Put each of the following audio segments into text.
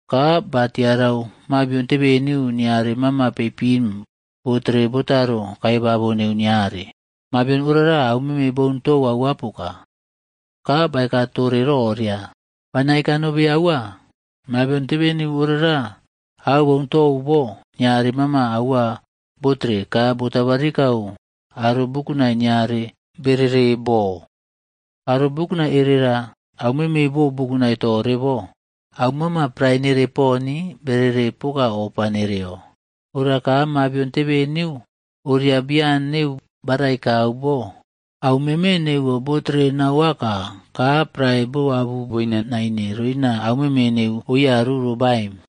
Ka ba tiarau mabion tebeniu niare mama peipin botere botaro kaibabo neu niare. Mabion orara aumeme boun tou aua poka. Ka baeka tore roria, “Bana eka nobe aua, mabion tebeniu orara au boun tou bo niare mama aua botere ka botabarikau aro bukunai niare berere bo. Aro bukunai erera aumeme bo bukunai tore bo, aumama prae nere poni berere poka ofa nereo. Ora ka mabion tebeneu oria bian neu barai kau bo, aumeme neuwo botere nau aka, ka prae boabu boina naine roina aumeme neu oyaru ro baim.”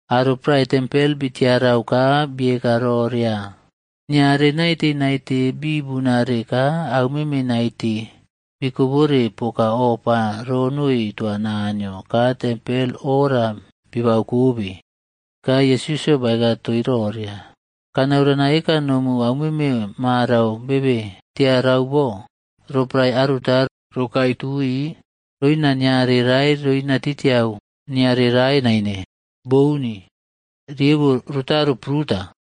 Aro prae tempel bitiarau ka bieka roria, “Niare naite naite bibunare ka aumeme naite bikobore poka ofa ronoi toa Naniyo ka tempel oꞌora bibau kobe.” Ka Yesusꞌyo baeka toii roria, “Kanau rana eka nou aumeme marau bebe tiarau bo, roporae aruta rokae tui, roina niare rae roina roinatiꞌtiau niarea rae naine, Bouni. Riebo rotaro pruta.”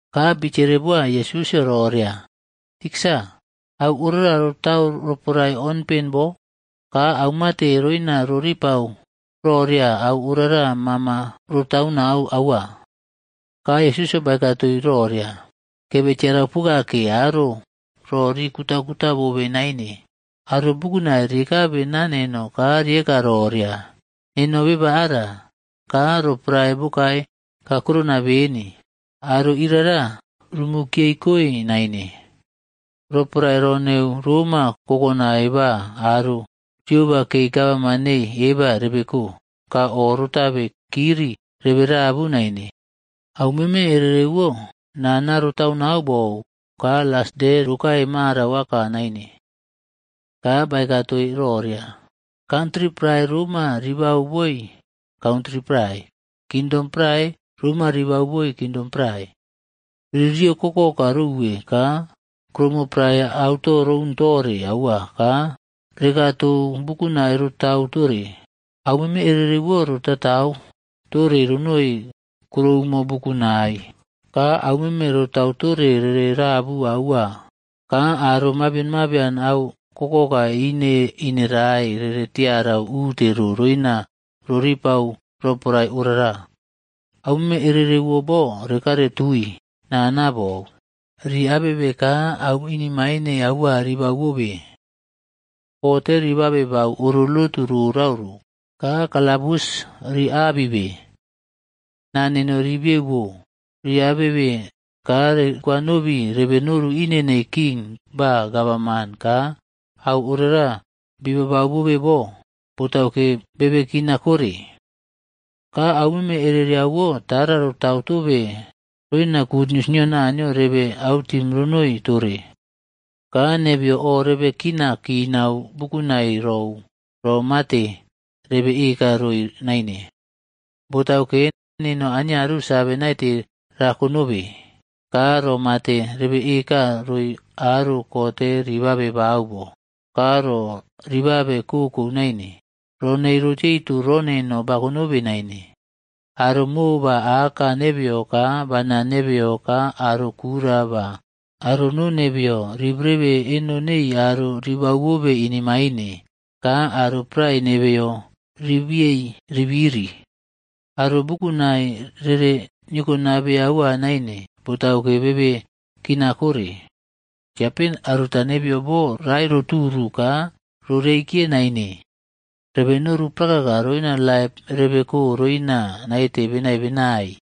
Ka bitiere boa Yesusꞌyo roria, “Tiksa au orara rotau roporae onpen bo? Ka aumate roina roripau roria au orara mama rotaunau aua?” Ka Yesusꞌyo baeka toii roria, “Kebe tiarau poka ke aro ro ri kutaꞌkuta bobe naine. Aro bukunai ri kabe naa neno ka riꞌeka roria, ‘Neno beba ara,’ ka ‘Roporae bokae kakurona beni.’ Aro irara, rumu kiyei koi naine. Roporae ro neu roma kokonai ba aro rioba kei gavman neii eba rebeko, ka o rotabe kiri rebe rabu naine. Au meme erereꞌwo nana rotaunau bou, ka las de rokae marauꞌaka naine.” Ka baeka toii roria, “Kantri prae roma ribau boi kantri prae. Kingdom prae roma ribau boi kingdom prae. Ririyo kokoka rouwe ka kuroumo prae auto roun tore aua ka rekaꞌtou bukunai rotau tore. Au meme erereꞌwo rotaꞌtau tore ronoi kuroumo bukunai. Ka aumeme rotau tore rere rabu aua ka aro mabian mabion au kokoka ineꞌinerae rere tiarau ute ro roina roripau roporae orara. “Aumeme ereriaꞌwo bo rekare tui nana bou, ri abebe ka au inemaine aua ribau bobe. Kote ri babe bau oro lotu rorau ro ka kalabus rii abibei. Naa neno rii bieubo rii abebe ka rikwanobi rebe noru ine nei king ba gavana ka au orara bibau bobe bo, botauke bebe kina kore. Ka au meme ereriaꞌwo tara rotau tobe roina gutnius nio Naniyo rebe autim ronoi tore. Ka nebeyo o rebe kina kinau bukunai rou ro mate rebe eka roi naine. Botauke, neno aniaru save naite rako nobe ka ro mate rebe eka roi aro kote riꞌbabe bau bo. Ka ro ribabe kokou naine, ro nei rotiyeuto ro neno bakonobe naine. Aro Mo ba Aka nebeyo ka bana nebeyo ka aro kura ba aro no nebeyo ribrebe eno nei aro ribau bobe inemaine. Ka aro prae nebeꞌyo ribiyei ribiri. Aro bukunai rere niokobabe aua naine, botauke bebe kinaꞌkore. Tiape aruta nebeyo bo raeꞌroturu ka roreikiye naine.b Rebe noru prakaka roina laip rebeko roina naite benai benai.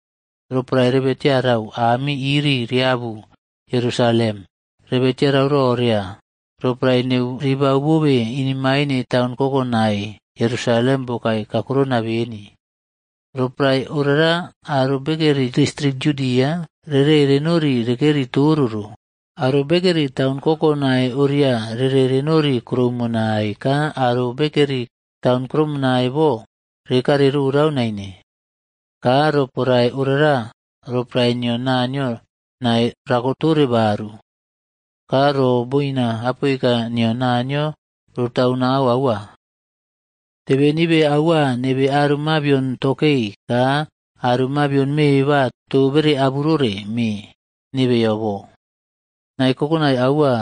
“Roporae rebe tiarai ami iri riabu Yerusalem, rebe tiarau roria roporae neu ribau bobe inemaine taun kokonai Yerusalem bokae kakurona beni. Roporae orara aro bekeri distrik Yudia rere renori rekeri toro ro. Aro bekeri taun kokonai oria rere renori krumonai ka aro bekeri taun krumonai bo rekare rorau naine. Ka roporae orara roporae nio Naniyo nae rakotore baru, ka ro boina apoika nio Naniyo rotau nau aua. Tebenibe aua nebe aro mabion tokei ka aro mabion me ba too bere aburore mee nebeyo bo. Nae kokonai aua,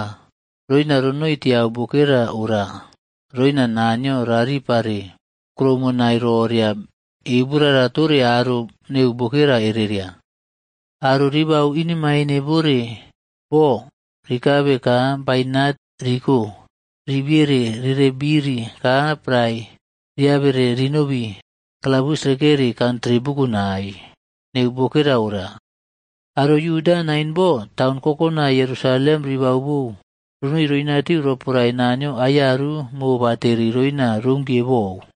roina ronoi tiau bokera ora roina Naniyo raꞌripare kuroumonai roria euborara tore aro neu bokera ereria. Aro ribau inemaine bore bo rikabe ka bainat riko riꞌbiere rere biri ka prae riabere rinobi kalabus rekeri kantri bukunai neu bokera ora. Aro Yuda nain bo taun kokonai Yerusalem ribaubou ronoi roinatu roporae Naniyo aiyaru mobateri roina rounkiye bou.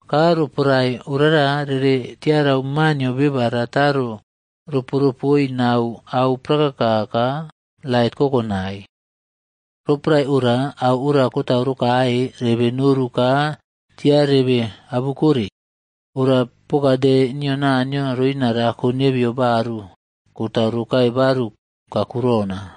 Ka roporae orara rere tiarau Maa nio Beba rataro roporopoi nau au prakaka ka lait kokonai. Roporae ora au ora kotau rokae, rebe noru ka tia rebe abukore, ora poka de nio Naniyo roina rako nebeyo baru kotau rokae baru kakurona.”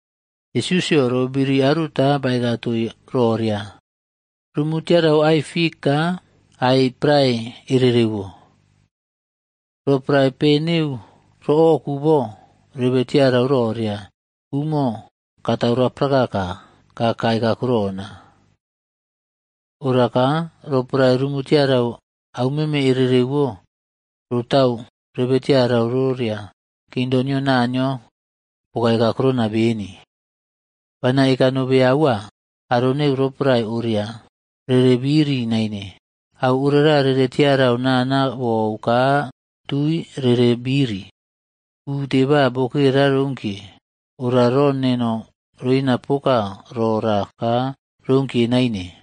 Yesusꞌyo roꞌbiri aruta baeka toii roria, “Rumu tiara ai fikc ka ai prae ererewo. Roporae pe neu roꞌoku bo, rebe tiarau roria umo katau raprakaka kakae kakurona. Ora ka roporae rumu tiara aumeme erereꞌwo rotau, rebe tiarau roria kingdom nio Naniyo bokae kakurona beni. “Bana eka nobe aua, aro neu roporae oria rere biri naine, au orara rere tiarau nana bou ka tui rere biri. Ute ba bokera rounkiye, ora ro neno roina poka rora ka rounkiye naine.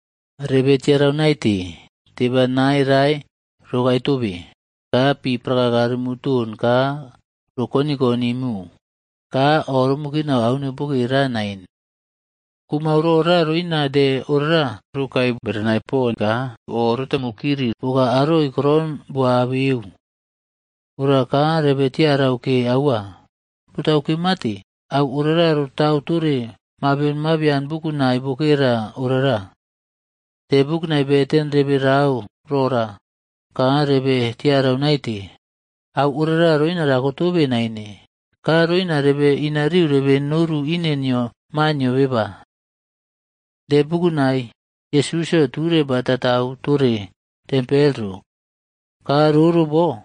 “Rebe tiarau naite, teba nae rae rokae tobe, ka pi prakaka rumu ton ka rokoniꞌkonimu, ka oꞌromu kinau au neu bokera ora nain. Kumau rora roina de ora rokae berenai pon ka oꞌrotamu kiri poka aroi koron bo abeu. Ora ka rebe tiarau ke aua. Botauke mate, au orara rotau tore mabion mabian bukunai bokera orara. De bukunai beten rebe rau rora ka rebe tiarau naite, au orara roina rakotobe naine, ka roina rebe inariu rebe noru ine nio Maa nio Beba.” De bukunai Yesusꞌyo ture bataꞌtau tore tempel ro. Ka roro bo,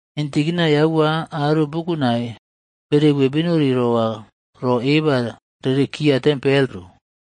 Intikinai aua aro bukunai bereuwe benori roa ro eba rerekiya tempel ro.